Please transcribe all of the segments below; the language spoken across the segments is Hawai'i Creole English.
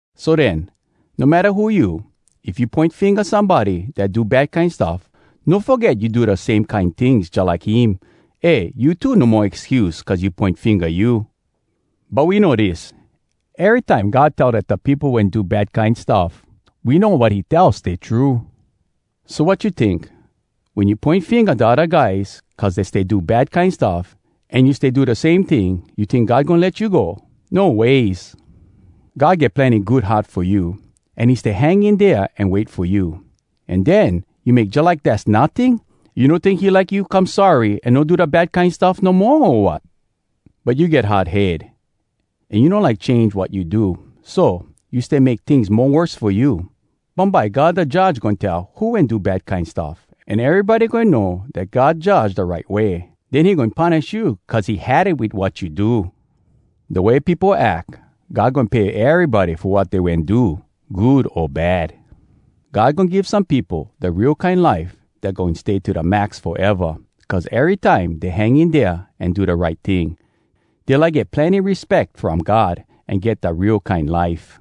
So den, no matta who you, if you poin finga somebody dat do bad kine stuff, no foget you do da same kine tings jalike him. Eh, you too no mo excuse cuz you poin finga you. But we know dis: Erytime God tell dat da peopo wen do bad kine stuff, we know wat he tell stay true. So, wat you tink? Wen you poin finga da odda guys cuz dey stay do bad kine stuff, an you stay do da same ting, you tink God goin let you go? No ways! God get plenny good heart fo you, an he stay hang in dea an wait fo you. An den, you make jalike dass notting? You no tink he like you come sorry an no do da bad kine stuff no moa, o wat?! But you get hard head. An you no like change wat you do. So, you stay make tings mo worse fo you. Bumbye God da Judge goin tell who wen do bad kine stuff, an erybody goin know dat God judge da right way. Den he goin punish you cuz he had it wit wat you do. Da way peopo ack, God goin pay erybody fo wat dey wen do, good o bad. God goin give some peopo da real kine life dat goin stay to da max foeva, cuz erytime dey hang in dea an do da right ting. Dey like get plenny respeck from God, an get da real kine life.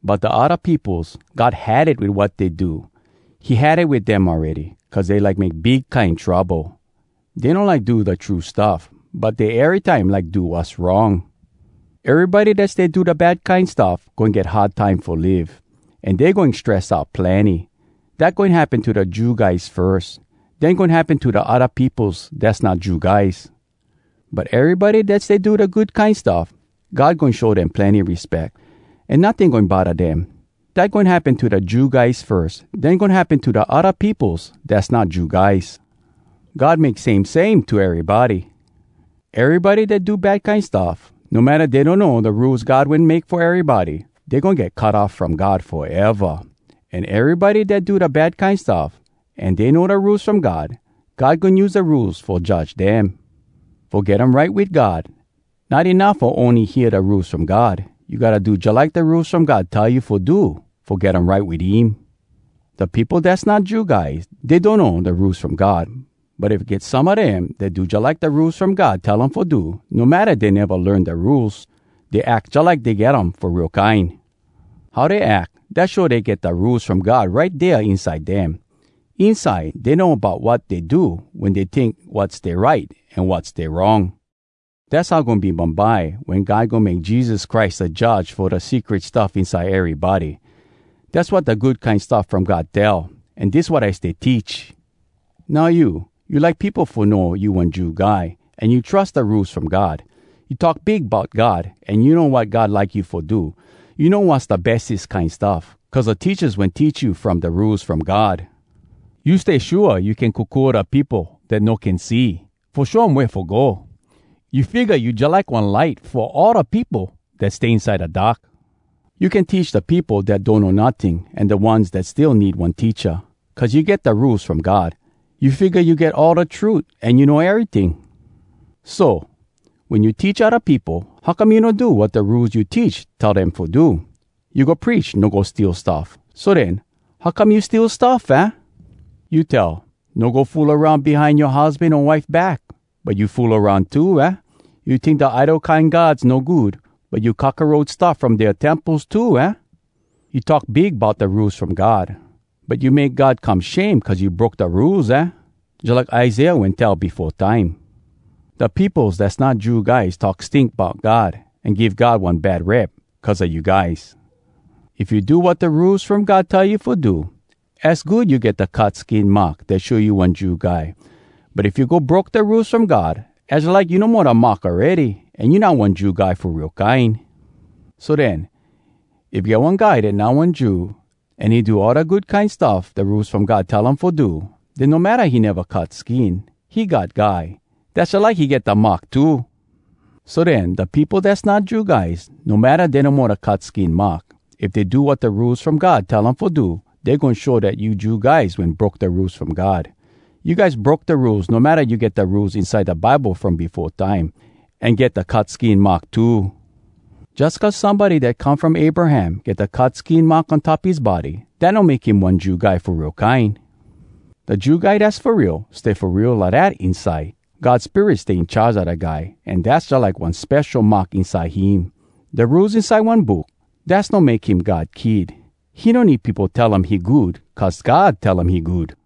But da odda peopos, God had it wit wat dey do. He had it wit dem awready, cuz dey like make big kine trouble. Dey no like do da true stuff, but dey erytime like do wass wrong. Erybody dat stay do da bad kine stuff goin get hard time fo live, an dey goin stress out plenny. Dat goin happen to da Jew guys firs. Den goin happen to da odda peopos dass not Jew guys. But erybody dat stay do da good kine stuff, God goin show dem plenny respeck, an notting goin bodda dem. Dat goin happen to da Jew guys firs. Den goin happen to da odda peopos dass not Jew guys. God make same same to erybody. Erybody dat do bad kine stuff, no matta dey donno da Rules God wen make fo erybody, dey goin get cut off from God foeva. An erybody dat do da bad kine stuff, an dey know da Rules From God, God goin use da Rules fo judge dem. Fo get um right wit God, not enuff fo ony hear da Rules From God. You gotta do jalike da Rules From God tell you fo do fo get um right wit him. Da peopo dass not Jew guys, dey donno da Rules From God. But if get some a dem dat do jalike da Rules From God tell um fo do, no matta dey neva learn da Rules, dey ack jalike dey get um fo real kine. How dey ack, dat show dey get da Rules From God right dea inside dem. Inside dey know bout wat dey do wen dey tink wat stay right an wat stay wrong. Dass how goin be bumbye wen God goin make Jesus Christ da Judge fo da secret stuff inside erybody. Dass wat da Good Kine Stuff From God tell, an dis wat I stay teach. Now you, you like peopo fo know you one Jew guy, an you trus da Rules From God. You talk big bout God, an you know wat God like you fo do. You know wass da bestes kine stuff, cuz da teachas wen teach you from da Rules From God. You stay shua you can kokua da peopo dat no can see fo show um wea fo go. You figga you jalike one light fo all da peopo dat stay inside da dark. You can teach da peopo dat donno notting an da ones dat still need one teacha. Cuz you get da Rules From God, you figga you get all da trut an you know eryting. So, wen you teach odda peopo, how come you no do wat da Rules you teach tell dem fo do? You go preach no go steal stuff. So den, how come you steal stuff, aah? You tell, “No go fool aroun behind yoa husban o wife back.” But you fool aroun too, aah? You tink da idol kine gods no good. But you cockaroach stuff from dea temples too, aah? You talk big bout da Rules From God. But you make God come shame cuz you broke da Rules, aah? Jalike Isaiah wen tell befo time, “Da peopos dass not Jew guys talk stink bout God an give God one bad rep cuz a you guys.” If you do wat da Rules From God tell you fo do, az good you get da cut skin mark dat show you one Jew guy. But if you go broke da Rules From God, az jalike you no mo da mark awready, an you not one Jew guy fo real kine. So den, if get one guy dat not one Jew, an he do all da good kine stuff da Rules From God tell um fo do, den no matta he neva cut skin, he God guy. Dass jalike he get da mark too. So den, da peopo dass not Jew guys, no matta dey no mo da cut skin mark, if dey do wat da Rules From God tell um fo do, dey goin show dat you Jew guys wen broke da Rules From God. You guys broke da Rules no matta you get da Rules inside da Bible from befo time, an get da cut skin mark too. Jus cuz somebody dat come from Abraham get da cut skin mark on top his body, dat no make him one Jew guy fo real kine. Da Jew guy dass fo real, stay fo real lidat inside. God Spirit stay in charge a da guy, an dass jalike one spesho mark inside him. Da Rules inside one book, dass no make him God kid. He no need peopo tell um he good cuz God tell um he good.